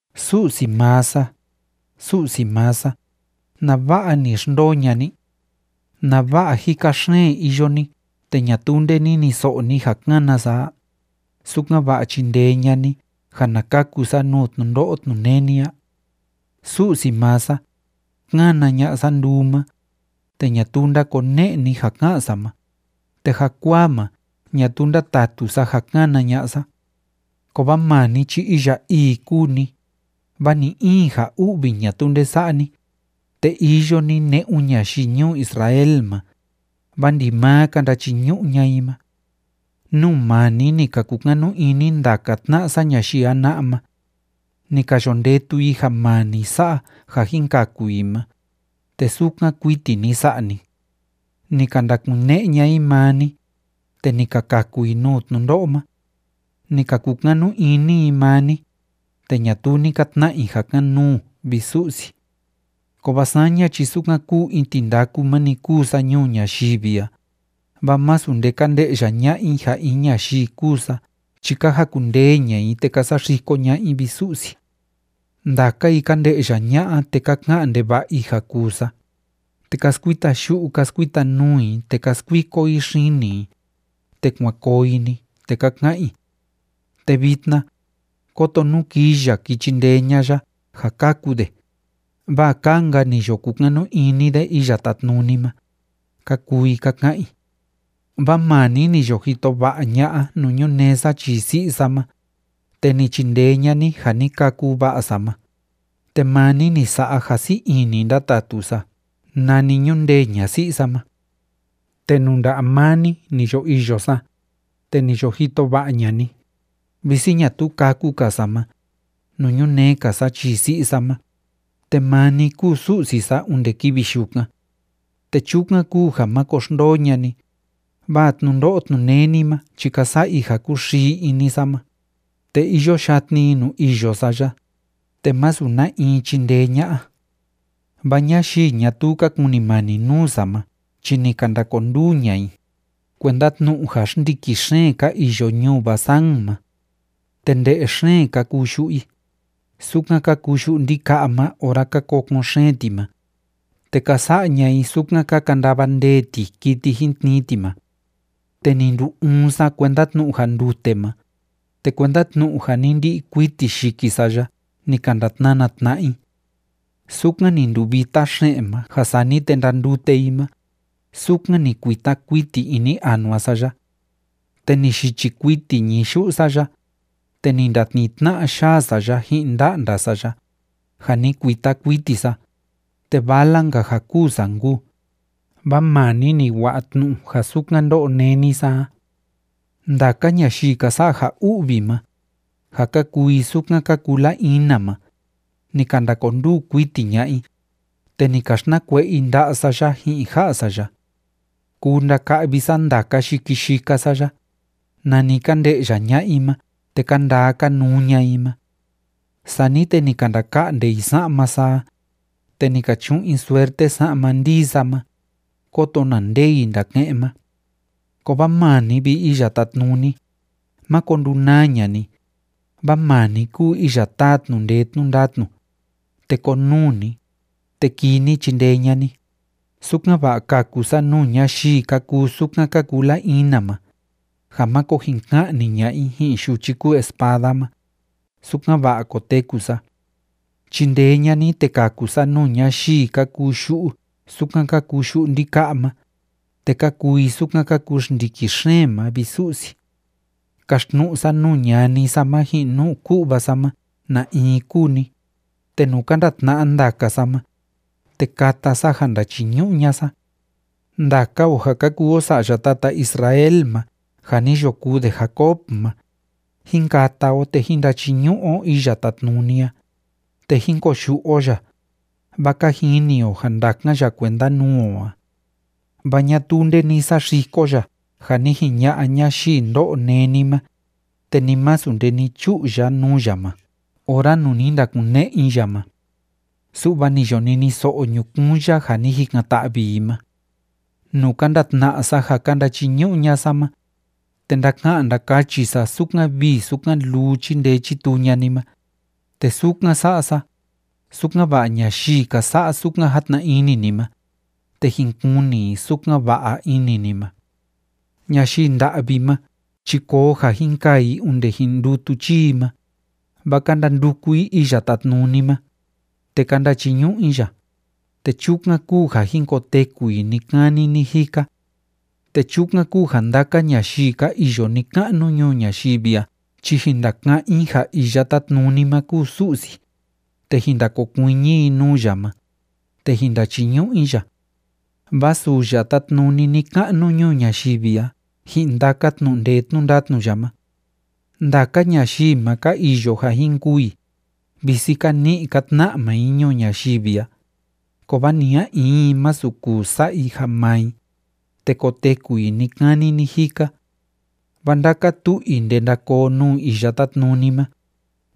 Su'si maa sa, Su'si maa sa, ¿nava'a ni xndoo ña'a ni? ¿Nava'a jika xeen iyo ni te ñatuu nde niniso'o ni ja kána sa a, sukan‑va'a chindee ña'a ni ja na kaku sa nuu tnundo'o tnuneni a? Su'si maa sa, kána ña'a sa nduu ma, te ñatuu ndákone'e ni ja ká'an sa ma, te jakuaa ma ñatuu ndátatu sa ja kána ña'a sa. Kovaa maa ni chi iya ii kúu ni, vaa ni‑in ja u'vi ñatuu nde sa'a ni, te iyo ni ne'un ñayii ñuu Israel ma, vaa ndimaa ka ndachiñu'u ña'a i ma. Nuu maa ni ni ka kukanu ini ndaka tna'a sa ñayii jana'a ma. Ni ka yo ndetu i ja maa ni sa'a ja jin kaku i ma, te sukan kuiti ni sa'a ni. Ni ka ndakune'e ña'a i maa ni, te ni ka kaku i nuu tnundo'o ma. Ni ka kukanu ini i maa ni, te ñatuu ni ka tna'a i ja kan‑nuu, vi Su'si. Kovaa saña chi sukan kúu in tindaku ma‑ni kúu sa nuu ñayii a, vaa masu nde ka nde'ya ña'a i ja in ñayii kúu sa chi ka jakundee ña'a i, te ka saxiko ña'a i, vi Su'si. Ndaka i ka nde'ya ña'a, te ka ka'an ndeva'a i ja kuu sa, te ka skuita yu'u ka skuita nuu i, te ka skuiko i xini i, te kuan koo i‑ni, te ka ka'an i: “Te vitna, kóto nú kii ya ki chindee ña'a ya ja kaku de, vaa kaa‑nka ni yo kukanu ini de Iya Tátnuni ma”, ka kuu i ka ka'an i. Vaa maa ni ni yo jito va'a ña'a nuu ñunee sa chii si'i sa ma, te ni chindee ña'a ni ja ni kâku va'a sa ma, te maa ni ni sa'a ja sii ini ndátatu sa nani ñundee ña'a si'i sa ma. Te nuu nda'a maa ni ni yo iyo sa, te ni yo jito va'a ña'a ni, visi ñatuu kâku‑ka sa ma, nuu ñunee‑ka sa chii si'i sa ma, te maa ni kúu Su'si sa onde kivi yukan. Te chukan kúu ja máko xndoo ña'a ni, vaa tnundo'o tnuneni ma chi ka sa'a i ja kúxii ini sa ma, te iyo yatni i nuu iyo sa ya, te másu na in chindee ña'a. Vaa ñayii ñatuu ka kunimani nuu sa ma chi ni ka ndakonduu ña'a i, kuenda tnu'u ja xndiki xeen ka iyo ñuu Basán ma. Te nde'e xeen ka kuu yu'u i, sukan ka kuu yu'u ndika'a ma ora ka kokon xeen ti ma, te ka sa'a ña'a i sukan ka kandava ndee ti kiti jin tnii ti ma. Te ni ndu‑uun sa, kuenda tnu'u ja ndute ma, te kuenda tnu'u ja ni ndi'i kuiti yiki sa ya ni ka ndatnana tna'a i. Sukan ni nduvita xe'en ma ja sani te ndandute i ma, sukan ni kuita kuiti ini anua sa ya. Te ni yichi kuiti ñií yu'u sa ya, te ni ndatnii tna'a yaa sa ya ji'in nda'nda sa ya, jâ ni kuita kuiti sa, te vala‑nka ja kûu sa nkuu, vaa maa ni ni wa'a tnu'u ja sukan ndó'o néni sa a. Ndaka ñayii ka sa'a ja u'vi ma, ja ka kuu i sukan ka kuu la‑ina ma, ni ka ndakonduu kuiti ña'a i, te ni ka xtnakue'e i nda'a sa ya ji'in ja'a sa ya. Kuu ndaka'vi sa ndaka yiki sa ya, nani ka nde'ya ña'a i ma te ka ndaa ka nuu ña'a i ma. Sani te ni ka ndaka'nde i sa'ma sa a, te ni ka chu'un i suerte sa'ma ndii sa ma, kóto na nde i ndake'en ma. Kovaa maa ni, vi Iya Tátnuni, máko ndunaa ña'a ni, vaa maa ni kúu iya táa tnu'u ndee tnu'u ndatnu, te konuu ni, te kii ni chindee ña'a ni, sukan‑va'a kaku sa nuu ñayii ka kuu sukan ka kuu la‑ina ma, ja máko jin ka'ni ña'a i ji'in yuchi kúu espada ma, sukan‑va'a koteku sa. Chindee ña'a ni, te kaku sa nuu ñayii ka kuu yu'u sukan ka kuu yu'u ndika'a ma, te ka kuu i sukan ka kuu xndiki xeen ma, vi Su'si. Kaxtnu'u sa nuu ñani sa ma ji'in nuu ku'va sa ma na in kúu ni, te nuu ka ndatna'a ndaka sa ma, te kata sa ja ndachiñu'u ña'a sa. Ndaka o ja ka kuu o sa'ya tata Israel ma ja ni yo kuu de Jacob ma, jín kata o, te jín ndachiñu'u o Iya Tátnuni a, te jín koyu'u o ya, vaa ka jini o ja ndakan ya kuenda nuu o a. Vaa ñatuu nde ni saxiko ya ja ni jiña'a ñayii ndó'o néni ma, te ni masu nde ni chu'u ya nuu ya ma ora nuu ni ndakune'e i ya ma. Su'va ni yo niniso'o ñukuun ya ja ni jikan‑ta'vi i ma. Nuu ka ndatna'a sa ja ka ndachiñu'u ña'a sa ma, te ndaka'an ndakachi sa sukan vii sukan luu chíndee chítuu ña'a ni ma, te sukan sa'a sa, sukan‑va'a ñayii ka sa'a sukan játna ini ni ma, te jin kuni i sukan va'a ini ni ma. Ñayii nda'vi ma chi koo ja jin kaa i onde jin ndutu chii i ma, vaa ka ndanduku i Iya Tátnuni ma, te ka ndachiñu'u i ya, te chukan kúu ja jin koteku i ni‑kani ni‑jika. Te chukan kúu ja ndaka ñayii ka iyo ni‑ka'nu ñuu ñayivi a chi jin ndaka'án i ja Iya Tátnuni ma kúu Su'si, te jin ndakokuiñi i nuu ya ma, te jin ndachiñu'u i ya. Vaa suu ya tátnuni ni‑ka'nu ñuu ñayivi a ji'in ndaka tnu'u ndee tnu'u ndatnu ya ma. Ndaka ñayii ma ka iyo ja jin kûu i, visi ka ni'i ka tna'a maa i ñuu ñayivi a, kovaa ni a in i, másu kuu sa'a i ja maa i, te koteku i ni‑kani ni‑jika. Vaa ndaka tu'u i ndenda koo nuu Iya Tátnuni ma,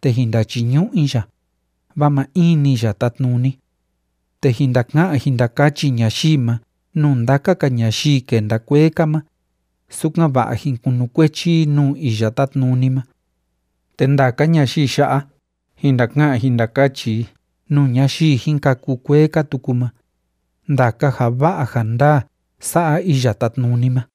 te jin ndachiñu'u i ya, vaa maa in‑ni ya tátnuni. Te jin ndaka'an jin ndakachi ñayii ma nuu ndaka‑ka ñayii kenda kuee‑ka ma, sukan‑va'a jin kunukuechi i nuu Iya Tátnuni ma. Te ndaka ñayii ya'a, jin ndaka'an jin ndakachi i nuu ñayii jin kâku kuee‑ka tuku ma, ndaka ja va'a ja ndaa sa'a Iya Tátnuni ma.